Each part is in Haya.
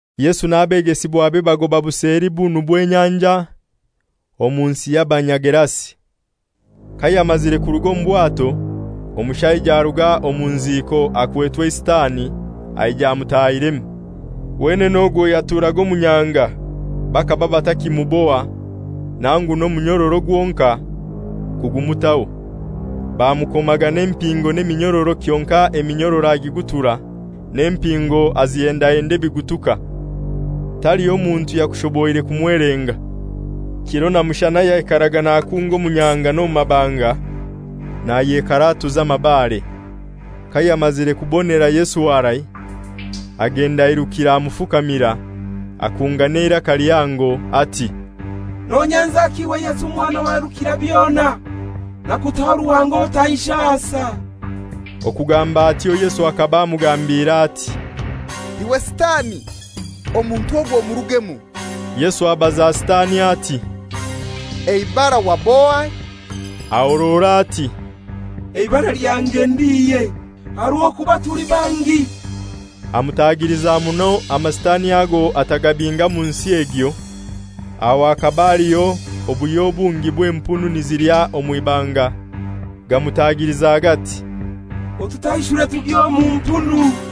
Yesu n'abegesibwabe bagoba buseli bunu bw'enyanja, omu nsi y'Abanyagerasi. Kayamazire kuruga omu bwato, omushaija aruga omu nziiko akwetwe eiSitani aija amutahiremu. Wenene ogwo yaturaga omu nyanga, bakaba batakimuboha, nangu n'omunyororo gwonkai kugumutaho. Bamukomaga n'empingo n'eminyororo kyonkai eminyororo agigutura, n'empingo azihendahenda ebigutuka. Taliho muntu yakushoboire kumwelenga. Kiro na mushana yaikaraga nakunga omu nyanga n'omu mabanga, nayekaratuza amabare. Kayamazire kubonera Yesu harai, agenda airukire amufukamira. Akunga n'eiraka lihango, ati, «Nonyenzaki iwe Yesu Mwana wa Rukirabyona? Nakutaho Ruhanga otanshasa.» Okugamba atyo Yesu akaba amugambiire ati, «Iwe Sitani omuntu ogu omurugemu!» Yesu abaza Sitani ati, «Eibara wab'ohai?» Ahorora ati, «Eibara lyange ndi Ihe; aha rw'okuba tuli bangi.» Amutagiliza muno Amasitani ago atagabinga mu nsi egyo. Aho hakaba haliho obuhyo bungi bw'empunu nizilya omw'ibanga; gamutagiliza gati, «Otutaishure tugye omu mpunu.»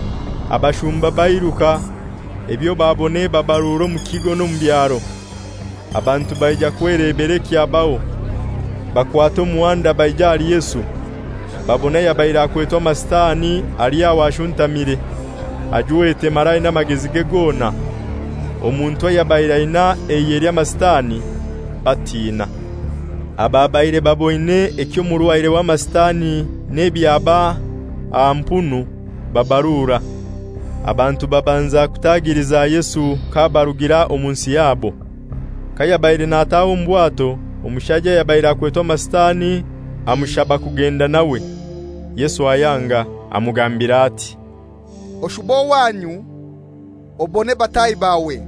Abashumba bairuka, ebyo babona eba baruro omu kigo n'omu byaro. Abantu baija kwelebera ekyabaho. Bakwata muhanda baija ahali Yesu, babona ayabaire akwetwe Amasitani ali aho ashuntamire, ajwete mara aina amagezige gona, omuntu ayabaire aina eihe ly'Amasitani, batina. Ababaire baboine eky'omurwaire w'Amasitani n'ebyaba aha mpunu babarura. Abantu babanza kutagiliza Yesu k'abarugira omu nsi yabo. Kayabaire nataha omu bwato omushaija ayabaire akwetwe Amasitani amushaba kugenda nawe. Yesu ayanga, amugambira ati, «Oshube owanyu obone bataahi bawe,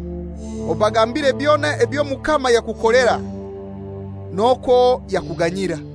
obagambiire byona eby'Omukama yakukolera, n'okwo yakuganyira.»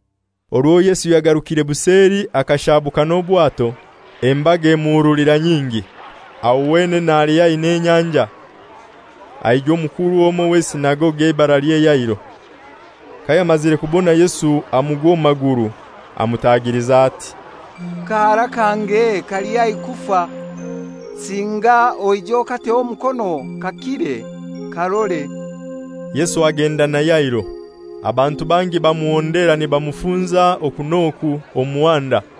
Orwo Yesu yagarukire buseli akashabuka n'obwato, embaga emuhurulira nyingi, aho wenene ali haihi n'enyanja. Aijwa omukuru omoi w'esinagogi eibaralye Yairo. Kayamazire kubona Yesu amugwa omu maguru, amutagiliza ati, «Kahara kange kali haihi kufa. Singa oije okateho omukono kakire, karore.» Yesu agenda na Yairo. Abantu bangi bamuhondera, nibamufunza oku n'oku omu muhanda.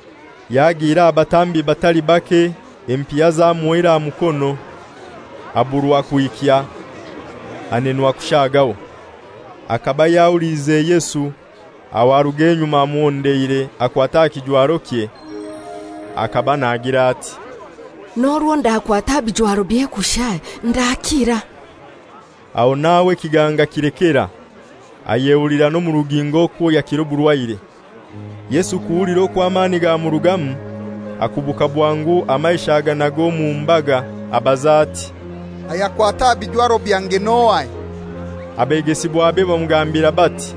yagiire aha batambi batali bake, empiha zamuhoire aha mukono, aburwa kwikya, anenwa kushagaho. Akaba yahuliize Yesu, aho aruga enyuma amuhondeire akwata aha kijwarokye. Akaba nagira ati, «N'orwo ndakwata aha bijwarobye kushai ndakira.» Aho n'aho ekiganga kilekera, ayehulira n'omu rugingo okwo yakira oburwaire. Yesu kuhulira okwo amani gamurugamu, akubuka bwangu amaisho aganaga omu mbaga, abaza ati, «Ayakwata aha bijwaro byange n'ohai?» Abegesibwabe bamugambira bati,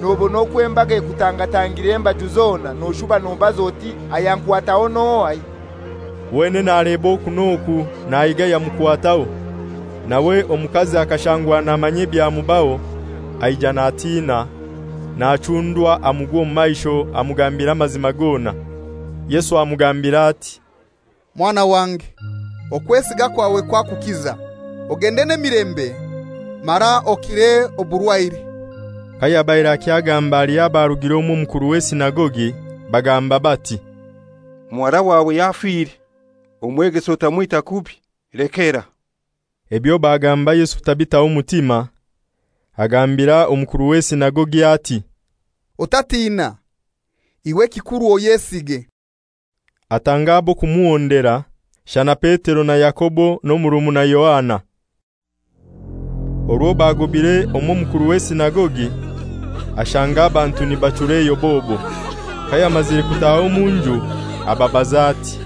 «Nobona okwo embaga ekutangatangire embaju zona, noshuba nobaza oti, ‹Ayankwataho n'ohai?›» Wenene aleba oku n'oku nahiga ayamukwataho. Nawe omukazi akashangwa namanya ebyamubaho, aija natina, nachundwa, amugwa omu maisho amugambira amazima gona. Yesu amugambira ati, «Mwana wange, okwesiga kwawe kwakukiza; ogende n'emilembe mara okire oburwaire.» Kayabaire akyagamba haliho abarugire omw'omukuru w'esinagogi, bagamba bati, «Muhara wawe yafire. Omwegesa otamwita kubi; lekera.» Ebyo bagamba Yesu tabitaho mutima, agambira omukuru w'esinagogi ati, «Otatina, iwe ekikuru oyesige.» Atanga ab'okumuhondera, shana Petero na Yakobo n'omurumuna Yohana. Orwo baagobire omw'omukuru w'esinagogi, ashanga abantu nibachura eyobobo. Kayamazire kutaha omu nju ababaza ati,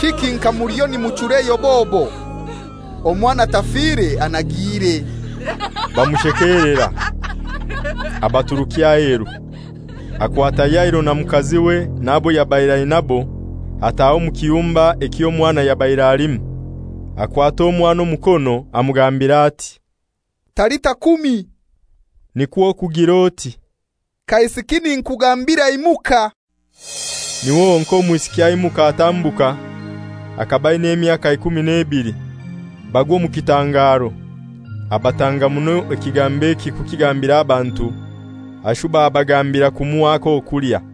«Kiki nka muliyo nimuchura eyobobo? Omwana tafire anagiire.» Bamushekelera. Abaturukya aheru. Akwata Yairo na mukaziwe n'abo yabaire ainabo, ataha omu kiyumba eky'omwana yabaire halimu. Akwata omwana omukono, amugambira ati, «Talita kumi;» nikwo kugir'oti, «Kaisiki ninkugambira imuka.» Niho honkai omwisiki aimuka atambuka (akaba aina emyaka ikumi n'ebili), bagwa omu kitangaro. Abatanga muno ekigambo eki kukigambira abantu, ashuba abagambira kumuha ak'okulya.